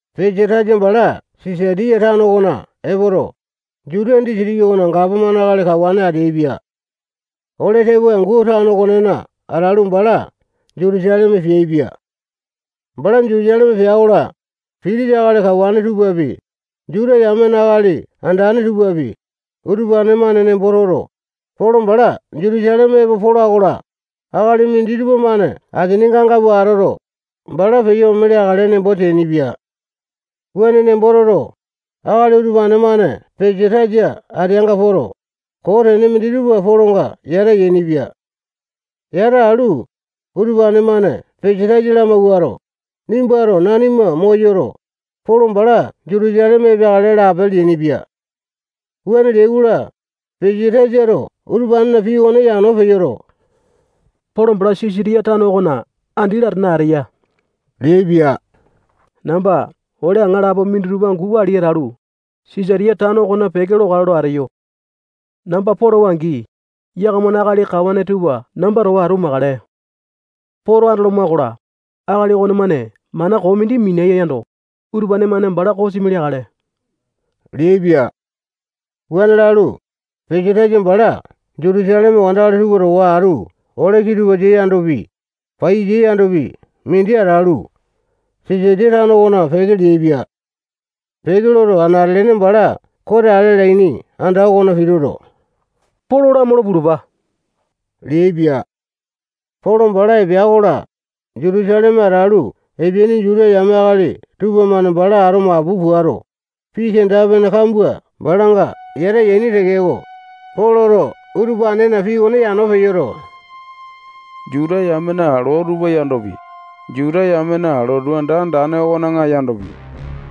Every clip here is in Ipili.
Pesatasa bala Sisatiya tano okona epoto, Jutiya disitiki okona gapomane akali kawane ateaipia. Ole tepoai angu tano okonena atalu, bala Jutusaleme peaipia. Bala Jutusaleme pea-kola, pitisa akali kawane tupapi, Juta yamena akali andane tupapi, utupane-mane nembo toto, Polo bala Jutusaleme epo pola-kola, akali minditupa-mane asininga anga pua atoto, bala peyo ome leakale nembo teainipia. Wuane nembo toto, akali utupane-mane Pesatasa ateanga poto, koo tene minditupa Polonga yata yainipia. Yata alu, utupane-mane Pesatasa lamawuato, nimbato nanima moyoto, Polo bala Jutusaleme epeakale lape leainipia. Wuane leai-kola, Pesatasato utupanena pii okone yano peyoto, Polo bala Sisatiya tano okona andi latane ateya leaipia. Namba ole aŋalapo minditupa angu wali atalu, Sisatiya tano okona peke lokale lo ateyo. Namba polowa-angi, yakamana akali kawane tupa namba towa atu makale. Poto andoloma-kola, akali okonemane mana koo mindi minia yando, utupane-mane bala kosimi leakale leaipia. Wuane lalu, Pesatasa bala Jutusaleme wandakali tupa towa atu ole kitupasa yandopi, paiyasa yandopi, mindi atalu, Sisatiya tano okona peke leaipia. Peke loto, anate-lene bala kote ale alaini anda okona pituto, Polo lamolo pulupa leaipia. Polo bala epea-kola, Jutusaleme atalu epeaini Juta yame akali tupamane bala ato mapu puato, pii kenda-pene kambua balanga yata yaini tekeko, Poloto utupanena pii okone yano peyoto, Juta yamena loo tupa yandopi, Juta yamena lotu anda andane okona yandopi,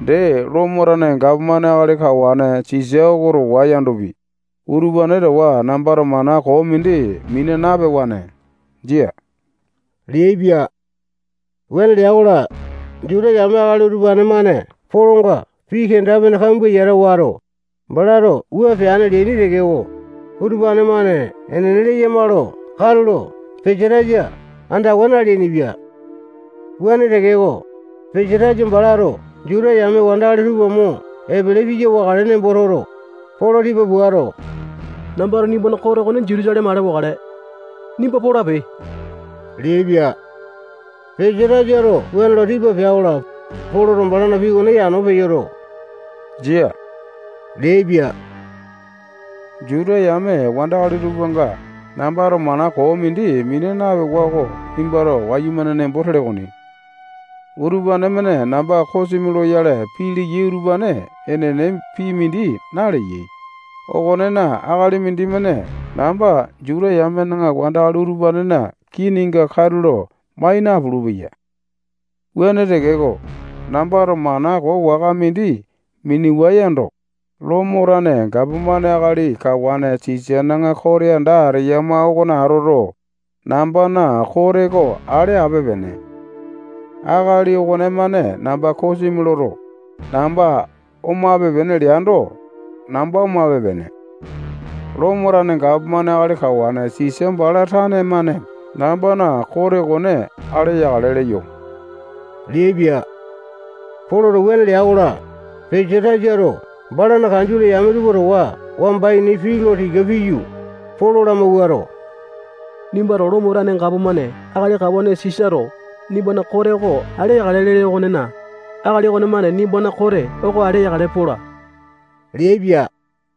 dee Lomo tane gapomane akali kawane Sisa oko towa yandopi, utupane towa nambato mana koo mindi mina napewane, jia leaipia. Wuane lea-kola, Juta yame akali utupane-mane Polonga pii kenda-pene kambua yata wato, balato wua peane leaini tekeko, utupane-mane enene leyama lo katulo Pesatasa andawa naleainipia. Wuane tekeko, Pesatasa balato Juta yame wandakali tupa mo epele piya wakale nembo toto, Polo tipa puato, nambato nimbana kote okone Jutusaleme ale wakale. Nimba polape leaipia. Pesatasato wuane lo tipa pea-kola, Poloto balana pii okone yano peyoto, jia leaipia. Juta yame wandakali tupanga nambato mana koo mindi mina napewa oko nimbato wayumane nembo tele okoni. Utupane-mane namba kosimi loyale pii leyai utupane enene pii mindi naleyai okonena, akali mindimane namba Juta yame wandakali utupanena kininga katulo mai napulu-peya. Wuane tekeko, nambato mana koo waka mindi minewa yando, Lomo tane gapomane akali kawane Sisana kote anda ateyama okona atoto, nambana kote oko ale ape-pene. Akali okonemane namba kosimi loto, namba omape-pene leando, namba omape-pene. Lomo tane gapomane akali kawane Sisa bala tane-mane nambana kote okone ale yakale leyo leaipia. Poloto wuane lea-kola, Pesatasato balana kanjole yame tupa towa wamba ini pii lo tika piyu, Polo lamawuato, nimbato Lomo tane gapomane akali kawane Sisato nimbana kote oko ale yakale lele okonena, akali okonemane nimbana kote oko ale yakale pola leaipia.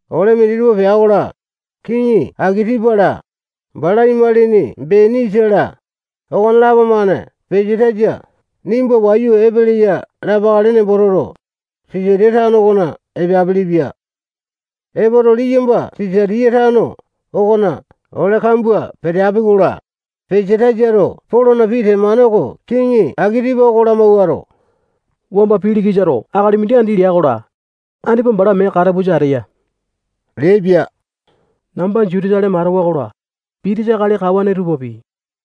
Ole minditupa pea-kola, Kiŋi Akitipa-la, bala imalini Benisa-la, okonelapo-mane Pesatasa nimba wayu epeleya lapakale nembo toto, Sisatiya tano okona epeapili-pia. Epoto, liyamba Sisaliya tano okona ole kambua peteapi-kola, Pesatasato Polona pii temane oko kiŋi Akitipa oko lamawuato, wamba Pilikisato akali mindi andi lea-kola, andipa bala mee katapusa ateya leaipia. Namba Jutusaleme atewa-kola, pitisa akali kawane tupapi,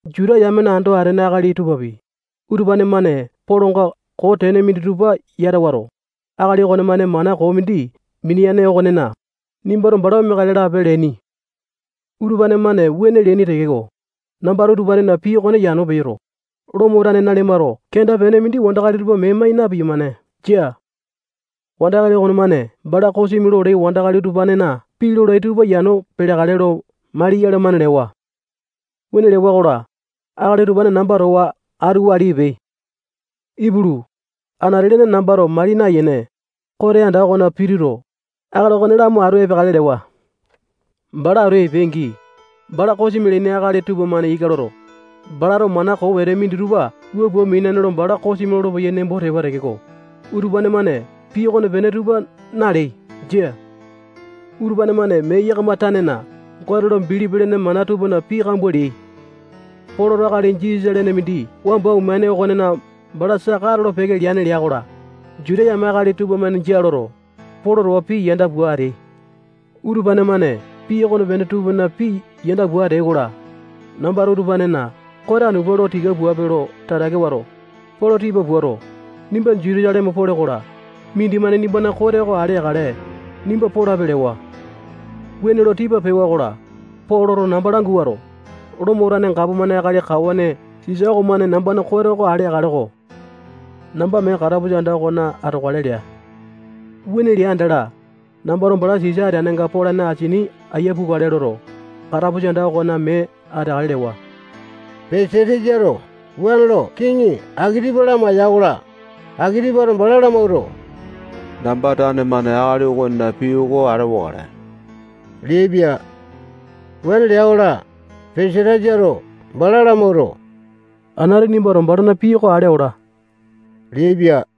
Juta yamena ando atene akali tupapi, utupane-mane Polonga koo tene minditupa yata wato, akali okonemane mana koo mindi mineane okonena, nimbato bala omeakale lape leaini. Utupane-mane wuane leaini tekeko, nambato utupanena pii okone yano peyoto, Lomo tane nanimato kenda-pene mindi wandakali tupa mee mai na-piyamane. Jia. Wandakali okonemane bala kosimi lolai wandakali utupanena pii lolai tupa yano peleakale lo mali yalamane lewa. Wuane lewa-kola, akali utupane namba towa atu wali epeai. Ipulu, anate-lene nambato mali nayene, kote anda okona pituto, akali okone lamo atu epeakale lewa. Bala atu epeai-angi, bala kosimi leaini akali tupamane ika loto, balato mana koo wete minditupa wua pua mineane lo bala kosimi lolopeyai nembo tewa tekeko, utupane-mane pii okonepene tupa naleai. Jia. Utupane-mane mee yakama tanena Gote lo bilipi lene mana tupana pii kambua leai. Poloto akali Jisasa lene mindi wamba omeane okone bala saka atolo-peke leane lea-kola, Juta yame akali tupamane jia loto, Polo towa pii yanda pua ateai. Utupane-mane pii okonepene tupana pii yanda pua ateai-kola, nambato utupanena kote anu pua lo tika puape lo tatake wato, Polo tipa puato, nimba Jutusaleme pole-kola, mindimane nimbana kote oko ale yakale, nimba polape lewa. Wuane lo tipa pewa-kola, Poloto namba languato, Lomo tane gapomane akali kawane Sisa okomane nambana kote oko ale yakale-ko. Namba mee katapusa anda okona atokale lea. Wuane lea andala, nambato bala Sisa ateyanga polane asini aiya pukale loto, bala katapusa anda okona mee ateakale lewa. Pesatasato wuane lo kiŋi Akitipa lamaiya-kola, Akitipato bala lamawuato, namba tane-mane akali okonena pii oko ale wakale leaipia. Wuane lea-kola, Pesatasato bala lamawuato, anati nimbato balana pii oko ale ola leaipia.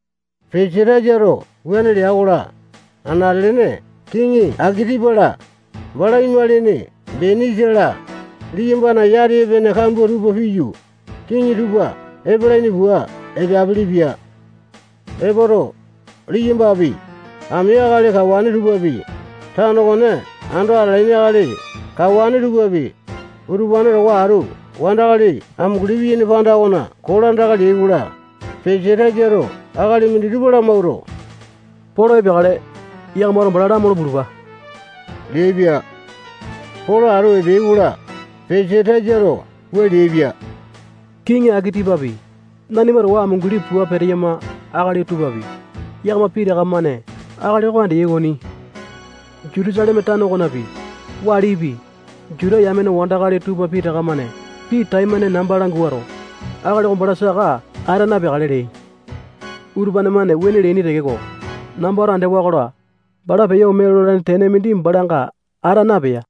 Pesatasato wuane lea-kola, anate-lene kiŋi Akitipa-la, bala imalini Benisa-la, liyambana yati epene kambua tupa piyu, kiŋi tupa epalaini pua epeapelepia. Epoto, liyambapi, ami akali kawane tupapi, tano okone ando atalaini akali kawane tupapi, utupane towa atu wandakali amunguli piyaini panda okona kolandaka leai-kola, Pesatasato akali minditupa lamawuato, Polo epeakale, yakamato bala lamolo pulupa leaipia. Polo atu epeai-kola, Pesatasato wua leaipia: Kiŋi Akitipapi, nanima towa amunguli pua peteyama akali tupapi, yakama pitaka-mane akali oko andeyai okoni. Jutusaleme tano okonapi, walipi, Juta yame wandakali tupa pitaka-mane pii taimane namba languato, akali oko bala saka ata napeakale leai. Utupane-mane wuane leaini tekeko, nambato andewa-kola, bala peyo ome lolane tene mindi balanga ata napea.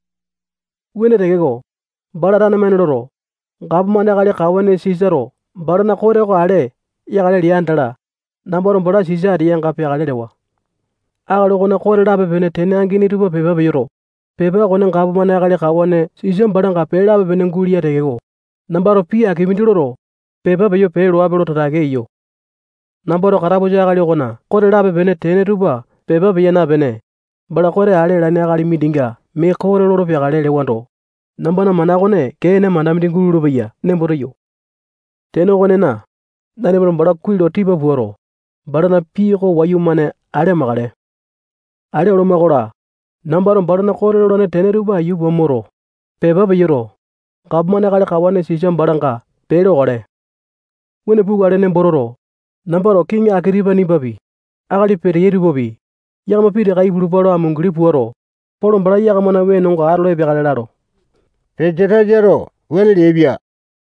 Wuane tekeko, bala tane-mane loto, gapomane akali kawane Sisato balana kote oko ale yakale lea andala, nambato bala Sisa ateyanga peakale lewa. Akali okona kote lape-pene tene angini tupa pepa peyoto, pepa okone gapomane akali kawane Sisa balanga pee lape-pene guleya tekeko, nambato pii aki mindi loto, pepa peyo pee loape lo tatake eyo. Nambato katapusa akali okona kote lape-pene tene tupa pepa peya napene, bala kote ale alane akali mindinga mee kote lolo peakale lewando, nambana mana okone kee ene mana mindi gulolo-peya nembo teyo. Tene okonena, nanimato bala kuai lo tipa puato, balana pii oko wayumane ale amakale. Ale oloma-kola, nambato balana kote lolane tene tupa aiya pua moto, pepa peyoto, gapomane akali kawane Sisa balanga pee lokale. Wuane pukale nembo toto, nambato kiŋi Akitipa nimbapi, akali peteyai tupapi, yakama pitaka ipulupa lo amunguli puato, Polo bala yakamana wenonga atolo epeakale lalo. Pesatasato wuane leaipia.